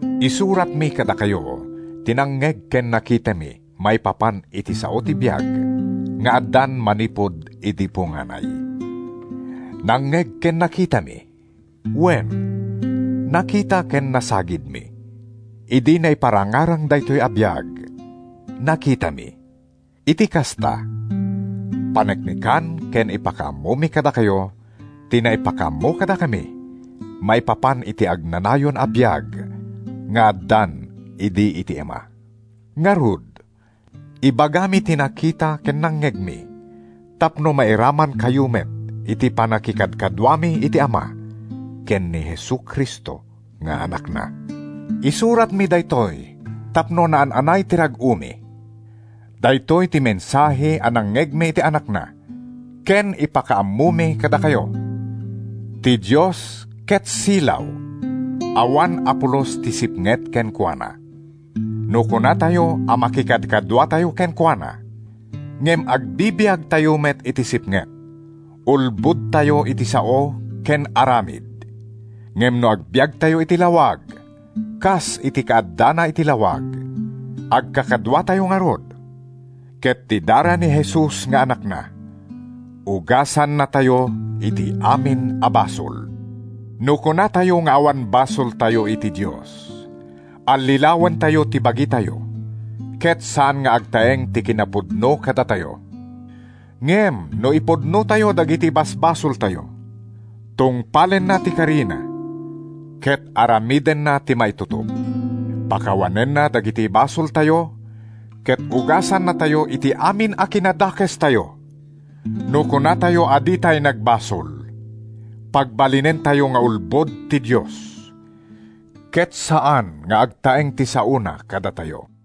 Isuratmi kadakayo ti nangngeg ken nakitami maipapan iti Sao ti biag nga addan manipud idi punganay. Nangngeg ken nakitami; wen, nakita ken nasagidmi. Idi naiparangarang daytoy a biag, nakitami; iti kasta, paneknekan ken ipakaammomi kadakayo ti naipakaammo kadakami maipapan iti agnanayon a biag nga addan idi iti Ama. Ngarud, ibagami ti nakita ken nangngegmi tapno mairamankayo met iti pannakikadkaduami iti Ama ken ni Jesu-Cristo nga Anakna. Isuratmi daytoy tapno naan-anay ti rag-omi. Daytoy ti mensahe a nangngegmi iti Anakna ken ipakaammomi kadakayo: Ti Dios ket silaw; awan a pulos ti sipnget kenkuana. No kunatayo a makikadkaduatayo kenkuana, ngem agbibiagtayo met iti sipnget, ulbodtayo iti sao ken aramid. Ngem no agbiagtayo iti lawag, a kas iti kaaddana iti lawag, agkakaduatayo ngarud, ket ti dara ni Jesus nga Anakna ugasannatayo iti amin a basol. No kunatayo nga awan basoltayo iti Dios, allilawentayo ti bagitayo ket saan nga agtaeng ti kinapudno kadatayo. Ngem no ipudnotayo dagiti basbasoltayo, tungpalenna ti karina ket aramidenna ti maitutop. Pakawanenna dagiti basoltayo ket ugasannatayo iti amin a kinadakestayo. No kunatayo a ditay nagbasol, pagbalinentayo nga ulbod ti Dios, ket saan nga agtaeng ti saona kadatayo.